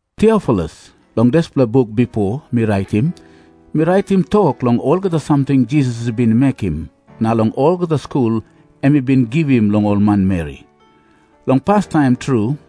Tiofilus, long dispela buk bipo mi raitim, mi raitim tok long olgeta samting Jisas i bin mekim na long olgeta skul em i bin givim long ol manmeri, long pastaim tru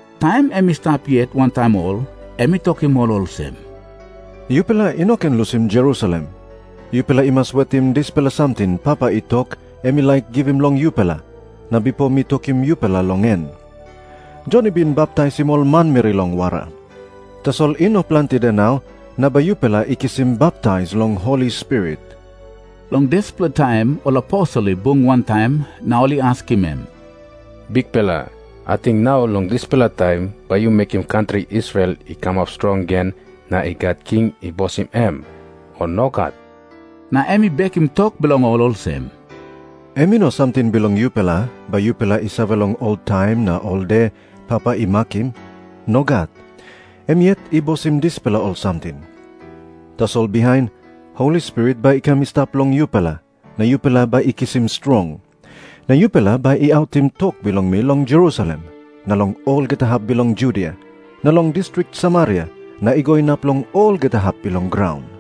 Taim em i stap yet wantaim ol, em i tokim ol olsem, "Yupela i no ken lusim Jerusalem. Yupela i mas wetim dispela samting Papa i tok em i laik givim long yupela, na bipo mi tokim yupela long en. Jon i bin baptaisim ol manmeri long wara. Tasol i no planti de nau na bai yupela i kisim baptais long Holi Spirit." Long dispela taim ol aposel i bung wantaim, na ol i askim em, "Bikpela, ating nau long dispela taim bai yu mekim kantri Israel i kamap strong gen na i gat king i bosim em, o nogat?" Na em i bekim tok bilong ol olsem, "Em i no samting bilong yupela bai yupela i save long ol taim na ol de Papa i makim. Nogat. Em yet i bosim dispela ol samting. Tasol bihain Holi Spirit bai i kam i stap long yupela, na yupela bai i kisim strong. Na yupela bai i autim tok bilong mi long Jerusalem, na long olgeta hap bilong Judia, na long distrik Samaria, na i go inap long olgeta hap bilong graun."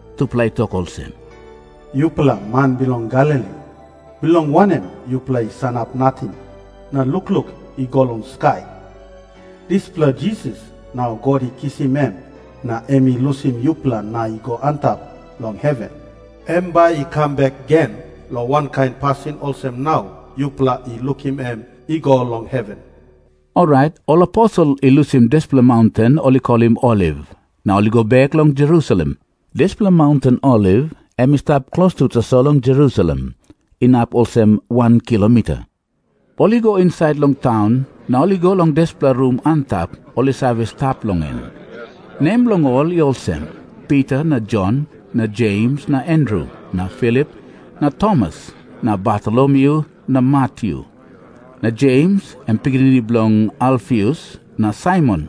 Tupela i tok olsem, "Yupela man bilong Galili, bilong wanem yupela i sanap nating na lukluk i go long skai? Dispela Jisas, nau God i kisim em na em i lusim yupela na i go antap long heven, em bai i kam bek gen long wankain pasin olsem nau yupela i lukim em i go long heven." Orait ol aposel i lusim dispela maunten ol i kolim Oliv, na ol i go bek long Jerusalem. Dispela maunten Oliv em i stap klostu tasol long Jerusalem, inap olsem wan kilomita. Ol i go insait long taun, na ol i go long dispela rum antap ol i save stap long en. Nembilong ol i olsem, Pita na Jon na Jems na Andru na Filip na Tomas na Bartolomyu na Matyu, na Jems, em pikinini bilong Alfius, na Saimon,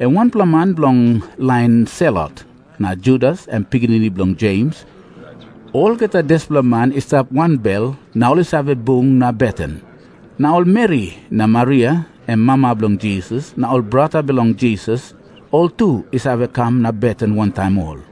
em wanpela man bilong lain Selot, na Judas, em pikinini bilong Jems. Olgeta dispela man i stap wanbel na ol i save bung na beten. Naol meri, na Maria, em mama bilong Jisas, na ol brata bilong Jisas, oltu i save kam na beten wantaim ol.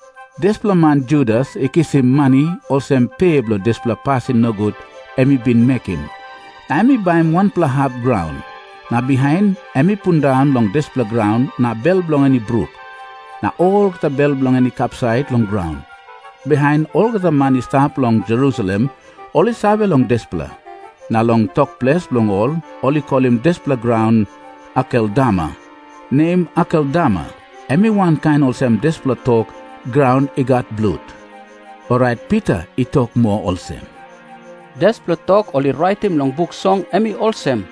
Dispela man Judas i kisim mani olsem pe bilong dispela pasin nogut em i bin mekim, na em i baim wanpela hap graun. Na bihain em i pundaun long dispela graun na bel bilong en i bruk, na olgeta bel bilong en i kapsait long graun. Bihain olgeta man i stap long Jerusalem ol i save long dispela. Na long tok ples bilong ol, ol i kolim dispela graun Akeldama. Nem "Akeldama" em i wankain olsem dispela tok, "Graun I Gat Blut." Orait Pita i tok moa olsem, "Dispela tok ol i raitim long Buk Song em i olsem,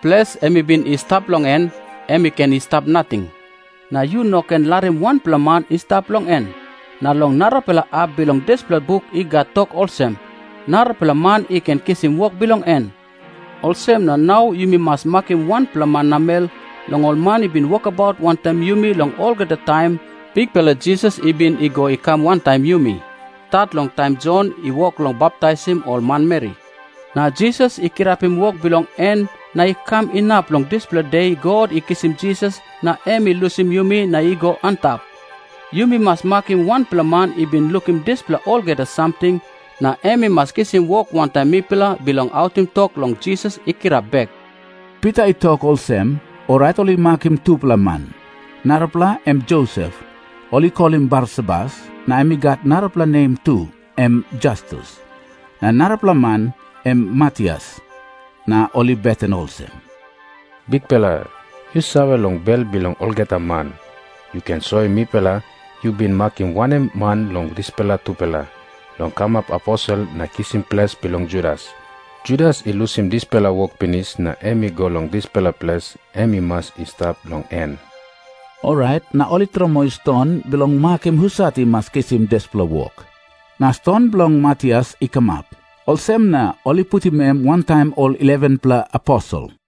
'Ples em i bin i stap long en, em i ken i stap nating, na yu no ken larim wanpela man i stap long en.' Na long narapela hap bilong dispela buk i gat tok olsem, 'Narapela man i ken kisim wok bilong en.' "Olsem na nau yumi mas makim wanpela man namel long ol man i bin wokabaut wantaim yumi long olgeta taim Bikpela Jisas i bin i go i kam wantaim yumi, stat long taim Jon i wok long baptaisim ol manmeri, na Jisas i kirapim wok bilong en na i kam inap long dispela de God i kisim Jisas na em i lusim yumi na i go antap. Yumi mas makim wanpela man i bin lukim dispela olgeta samting, na em i mas kisim wok wantaim mipela bilong autim tok long Jisas i kirap bek." Pita i tok olsem, orait ol i makim tupela man. Narapela em Josep, ol i kolim Barsabas, na em i gat narapela nem tu, em Jastus. Na narapela man em Matias. Na ol i beten olsem, "Bikpela, yu save long bel bilong olgeta man. Yu ken soim mipela, yu bin makim wanem man long dispela tupela long kamap aposel na kisim ples bilong Judas. Judas I lusim dispela wok pinis na em i go long dispela ples em i mas i stap long en." Orait na ol i tromoi ston bilong makim husat i mas kisim dispela wok, na ston bilong Matias i kamap. Olsem na ol i putim em wantaim ol 11-pela aposel.